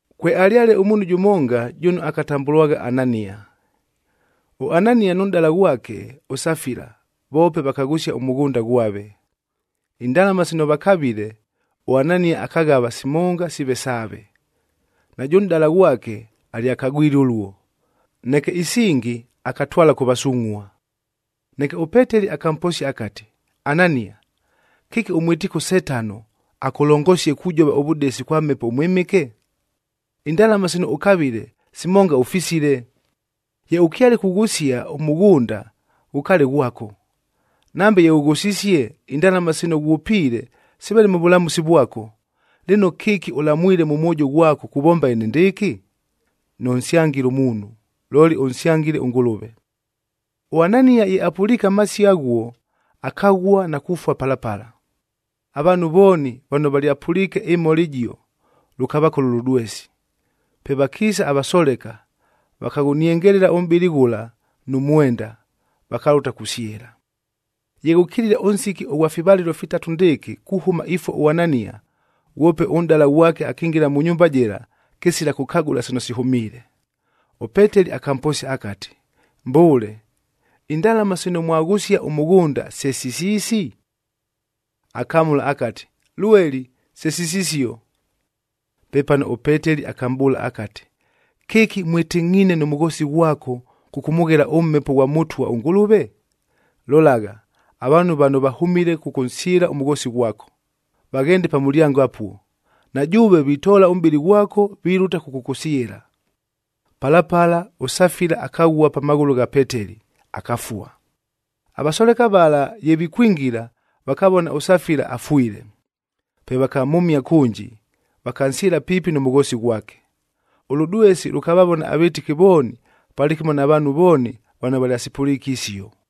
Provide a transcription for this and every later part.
Kwealyale ʉmuunhu jʉmonga jʉno akatambʉlwagha Anania. ɄAnania nʉ nʼdala ghwake ʉSafila voope vakaghʉsia ʉmʉghʉnda ghwave. Indalama sino vakavile, ʉAnania akaghava simonga siive saave. Najʉ nʼdala ghwake alyakagwile ʉluo. Neke isingi akatwala kʉ vasungʼhua. Neke ʉPeteli akamposia akati, “Anania! Kɨki ʉmwɨtiike ʉSetano akʉlongosie kujova ʉvʉdesi kwa Mhepo ʉMwɨmɨke? Indalama sino ʉkavile, simonga ʉfisile! Ye ʉkyale kughʉsia ʉmʉghʉnda, ghʉkaale ghwako. Nambe ye ʉghʉsisie, indalama sino ghwʉpiile siveele mʉ vʉlamʉsi vwako. Lɨno, kɨki ʉlamwile mʉ mwojo ghwako kuvomba enendɨɨkɨ? Nʉnsyangile muunhu, looli ʉnsyangile ʉNgʉlʉve!” ɄAnania ye apʉliike amasio aghuo, akaghua na kufua pala pala. Avaanhu vooni vano valyapʉliike ɨmhola ɨjio, lʉkavakola ʉlʉdwesi. Pe vakiisa avasoleka, vakaghʉniengelela ʉmʼbɨlɨ ghʉla nʉ mwenda, vakalʉta kusyɨla. Ye ghʉkilile ʉnsiki ʉghwa fivalɨlo fitatu ndɨɨkɨ kuhʉma ifua ʉAnania, ghwope ʉnʼdala ghwake akingila mʉ nyumba jɨla, kɨsila kʉkagʉla sino sihʉmiile. ɄPeteli akamposia akati, “Mbʉʉle, indalama sino mwaghʉsia ʉmʉghʉnda se sisiisi?” Akamʉla akati, “Lweli, se sisisio!” Pepano ʉPeteli akamʼbʉʉla akati, “Kɨki mwɨtɨngʼhiine nʉ mʉghoosi ghwako kʉkʉmʉghela ʉMhepo ghwa Mʉtwa ʉNgʉlʉve? Lolagha, avaanhu vano vahʉmile kʉkʉnsyɨla ʉmʉghoosi ghwako, vaghende pa mʉlyango apuo, na jʉʉve vitoola ʉmʼbɨlɨ ghwako, vilʉta kʉkʉkʉsyɨla!” Pala pala, ʉSafila akaghua pa maghʉlʉ gha Peteli, akafua. Avasoleka vala ye vikwingila, vakavona ʉSafila afwile. Pe vakamhʉmia kʉnji, vakansyɨla piipi nʉ mʉghoosi ghwake. Ʉlʉdwesi lʉkavavona avɨtɨki vooni palɨkɨmo na vaanhu vooni vano valyasipʉliike isio.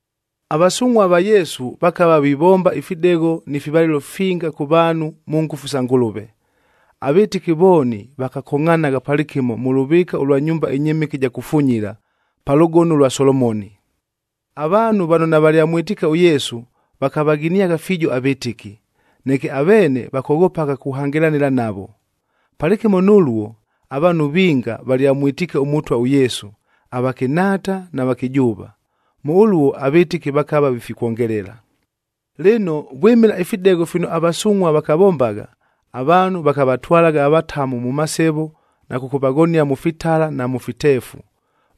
Avasungʼhua va Yesu vakava vivomba ifidegho ni fivalɨlo finga kʉ vaanhu mʉ ngʉfu sa Ngʉlʉve. Avɨtɨki vooni vakakongʼhanagha palɨkɨmo mʉ lʉvɨɨka ʉlwa nyumba ɨnyɨmɨke ɨja kufunyila, pa Lʉgono ʉlwa Solomoni. Avaanhu vano navalyamwɨtiike ʉYesu, vakavaghiniagha fiijo avɨtɨki, neke aveene vakoghopagha kuhangɨlanɨla navo. Palɨkɨmo nʉluo, avaanhu vinga valyamwɨtiike ʉMʉtwa ʉYesu, avakɨnhaata na vakɨjʉʉva. Mʉ ʉluo avɨtɨki vakava vifikwongelela. Lɨno, vwɨmɨla ifidegho fino avasungʼhua vakavombagha, avaanhu vakavatwalagha avatamu mʉ masevo na kʉkʉvaghonia mʉ fitala na mʉ fiteefu.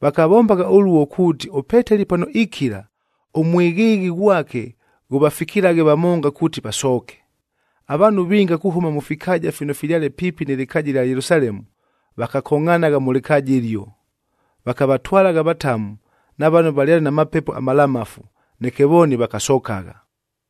Vakavombagha ʉluo kuuti ʉPeteli pano ikila, ʉmwɨghɨɨghɨ ghwake ghʉvafikilaghe vamonga kuuti vasooke. Avaanhu vinga kuhʉma mʉ fikaaja fino fyale piipi nɨ lɨkaaja ɨlya Yelusalemu, vakakongʼhanagha mʉ lɨkaaja ɨlio. Vakavatwalagha avatamu, na vano valyale na mapepo amalamafu, neke vooni vakasokagha.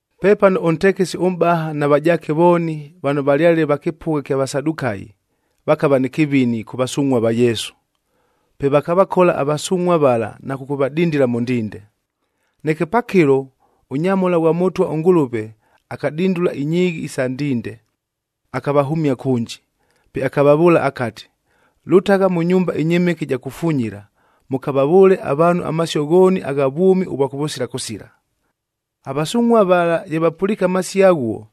Pepano ʉntekesi ʉmʼbaha na vajaake vooni, vano valyale va kɨpʉgha ɨkya Vasadukayi vakava nɨ kɨvini kʉ vasungʼhua va Yesu. Pe vakavakola avasungʼhua vala na kʉkʉvadindila mʉ ndinde. Neke pakɨlo, ʉnyamhola ghwa Mʉtwa ʉNgʉlʉve akadindula inyiighi isa ndinde, akavahʉmia kʉnji. Pe akavavʉʉla akati, “Lʉtagha mʉ nyumba ɨnyɨmɨke ɨja kufunyila, mʉkavavʉʉle avaanhu amasio ghooni agha vwʉmi ʉvwa kʉvʉsila kʉsila.” Avasungʼhua vala ye vapʉliike amasio aghuo,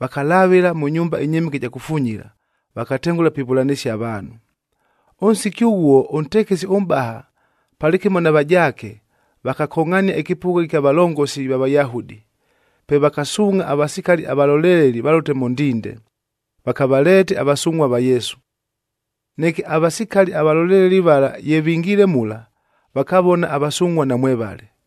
vakalavɨla mʉ nyumba ɨnyɨmɨke ɨja kufunyila, vakatengʉla pivʉlanɨsia avaanhu. Ʉnsiki ghʉghuo ʉntekesi ʉmʼbaha palɨkɨmo na vajaake, vakakongʼhania ɨkɨpʉgha ɨkya valongosi va Vayahudi. Pe vakasuungʼha avasikali avalolelelia valʉte mʉ ndinde, vakavaleete avasungʼhua va Yesu. Neke avasikali avaloleleli vala ye vingiile mula, vakavona avasungʼhua namwevale.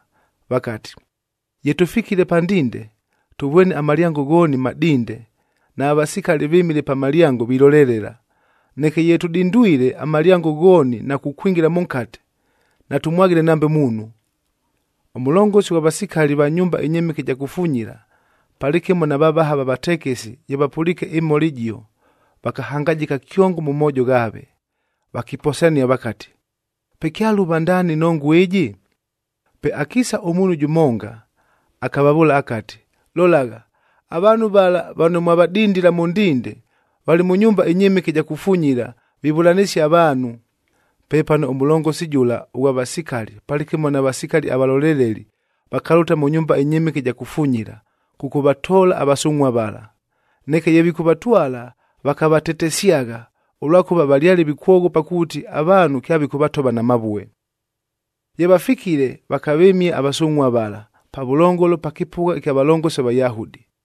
vakati, “Ye tʉfikile pa ndinde, tʉvwene amalyango ghooni madinde nava vasikali vɨmile pa malyango vilolelela. Neke ye tʉdindwile amalyango ghooni na kukwingila mʉnkate, natʉmwaghile nambe muunhu!” Ʉmʉlongosi ghwa vasikali va nyumba ɨnyɨmɨke ɨja kufunyila palɨkɨmo na vavaha va vatekesi ye vapʉliike ɨmhola ɨjio, vakahangajɨka kyongo mʉ moojo ghaave, vakiposania vakati, “Pe kyaluuva ndaani ɨnongua ɨjɨ!” Pe akiisa ʉmuunhu jʉmonga, akavavʉʉla akati, “Lolagha, avaanhu vala vano mwavadindila mʉ ndinde, valɨ mʉ nyumba ɨnyɨmɨke ɨja kufunyila vivʉlanɨsia avaanhu!” Pepano ʉmʉlongosi jʉla ʉghwa vasikali palɨkɨmo na vasikali avaloleleli, vakalʉta mʉ nyumba ɨnyɨmɨke ɨja kufunyila kʉkʉvatoola avasungʼhua vala. Neke ye vikʉvatwala, vakavatetesyagha, ʉlwakʉva valyale vikwoghopa kuuti avaanhu kyavikʉvatova na mavue. Ye vafikile, vakavɨmia avasungʼhua vala pavʉlongolo pa kɨpʉgha kya valongosi va Vayahudi.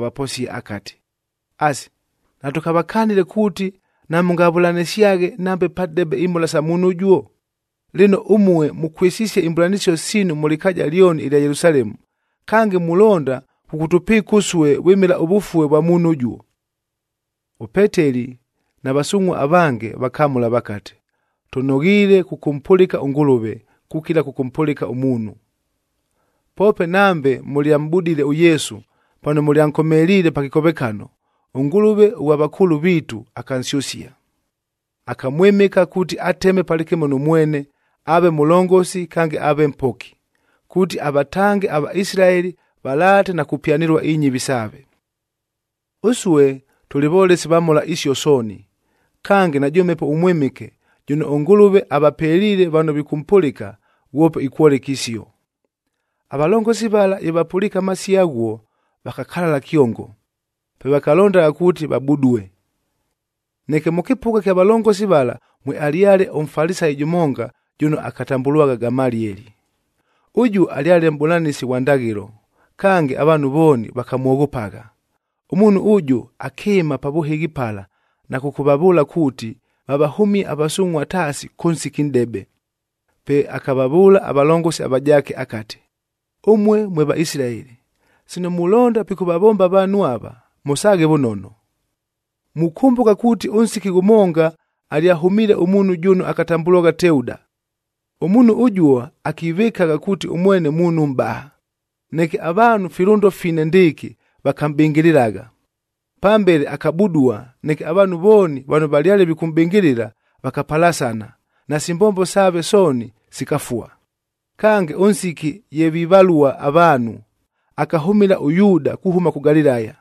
akati, “Asi, natʉkavakanile kuuti namʉngavʉlanɨsyaghe nambe padebe imhola sa muunhu ʉjuo? Lɨno, ʉmue mʉkwɨsisie imbʉlanɨsio siinu mʉ lɨkaaja lyoni ɨlya Yelusalemu, kange mulonda kʉkʉtʉpɨɨka ʉsue vwɨmɨla ʉvʉfue vwa muunhu ʉjuo!” ɄPeteli na vasungʼhua avange vakamʉla vakati, “Tʉnoghiile kʉkʉmpʉlɨka ʉNgʉlʉve, kukila kʉkʉmpʉlɨka ʉmuunhu! Poope nambe mʉlyamʼbudile ʉYesu pano mʉlyankomeliile pa kɨkovekano, ʉNgʉlʉve ʉghwa vakʉʉlʉ viitu akansyʉsia. Akamwɨmɨka kuuti ateme palɨkɨmo nʉ mwene,b aave Mʉlongosi kange aave Mpoki, kuuti avatange aVaisilaeli valaate na kupyanɨlua inyɨvi saave. Ʉsue tʉlɨ volesi va mhola isio sooni, kange najʉ Mhepo ʉMwɨmɨke jʉno ʉNgʉlʉve avapeliile vano vikʉmpʉlɨka, ghwope ikwoleka isio.” Avalongosi vala ye vapʉliike amasio aghuo, vakakalala kyongo, pe vakalondagha kuuti vabudue. Neke mʉ kɨpʉgha kya valongosi vala mwealyale ʉMfalisayic jʉmonga jʉno akatambʉlwagha Gamalieli. Ʉjuo alyale mʼbʉlanɨsi ghwa ndaghɨlo, kange avaanhu vooni vakamwoghopagha. Ʉmuunhu ʉjʉ akɨɨma pa vʉhɨghi pala na kʉkʉvavʉʉla kuuti vavahʉmie avasungʼhua taasi kʉ nsiki nʼdebe. Pe akavavʉʉla avalongosi avajaake akati, “Ʉmue mwe Vaisilaeli, sino mulonda pikʉvavomba avaanhu ava, mʉsaaghe vʉnono. Mukʉmbʉka kuuti ʉnsiki ghʉmonga alyahʉmiile ʉmuunhu jʉno akatambʉlwagha Teuda. Ʉmuunhu ʉjuo akivɨkagha kuuti ʉmwene muunhu mʼbaha, neke avaanhu filʉndo fine ndɨɨkɨ vakamʼbɨngɨlɨlagha. Pambele akabudua, neke avaanhu vooni vano valyale vikʉmʼbɨngɨlɨla vakapalasana, nasi mbombo saave sooni sikafua. Kange, ʉnsiki ye vivalua avaanhu, akahʉmɨla ʉYuuda kuhʉma kʉ Galilaya.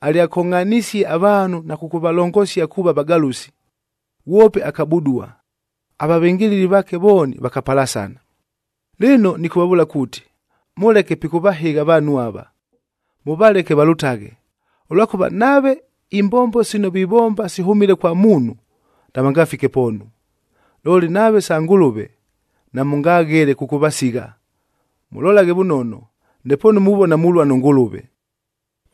Alyakongʼhanisie avaanhu na kʉkʉvalongosia kuuva vagalʉsi, ghwope akabudua, avavɨngɨlɨli vaake vooni vakapalasana. Lɨno nɨkʉvavʉʉla kuuti, mʉleke pikʉvahɨgha avaanhu ava, mʉvaleke valʉtaghe. Ʉlwakʉva nave imbombo sino vivomba sihʉmile kwa muunhu, navangafike poonu, looli nave sa Ngʉlʉve namʉngaghele kʉkʉvasigha. Mʉlolaghe vʉnono, ndepoonu muvona mulua nʉ Ngʉlʉve.”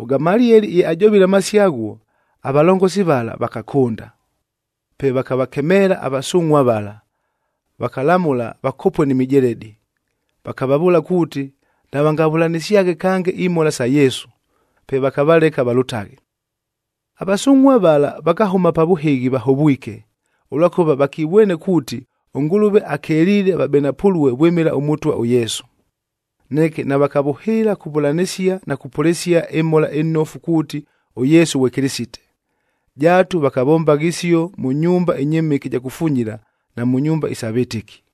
ɄGamalieli ye ajovile amasio aghuo, avalongosi vala vakakʉnda. Pe vakavakemeela avasungʼhua vala, vakalamʉla vakopue ni mijeledi, vakavavʉʉla kuuti navangavʉlanɨsyaghe kange imhola sa Yesu. Pe vakavaleka valʉtaghe. Avasungʼhua vala vakahʉma pa vʉhɨghi vahovwike, ʉlwakʉva vakivwene kuuti, ʉNgʉlʉve akeliile vabenapʉlue vwɨmɨla ʉMʉtwa ʉYesu. Neke navakavʉhɨɨla kuvʉlanɨsia na kupʉlɨsia ɨMhola ɨNofu kuuti ʉYesu ghwe Kɨlɨsite.d Jaatu vakavombagha isio mʉ nyumba ɨnyɨmɨke ɨja kufunyila na mʉ nyumba isa vɨtɨki.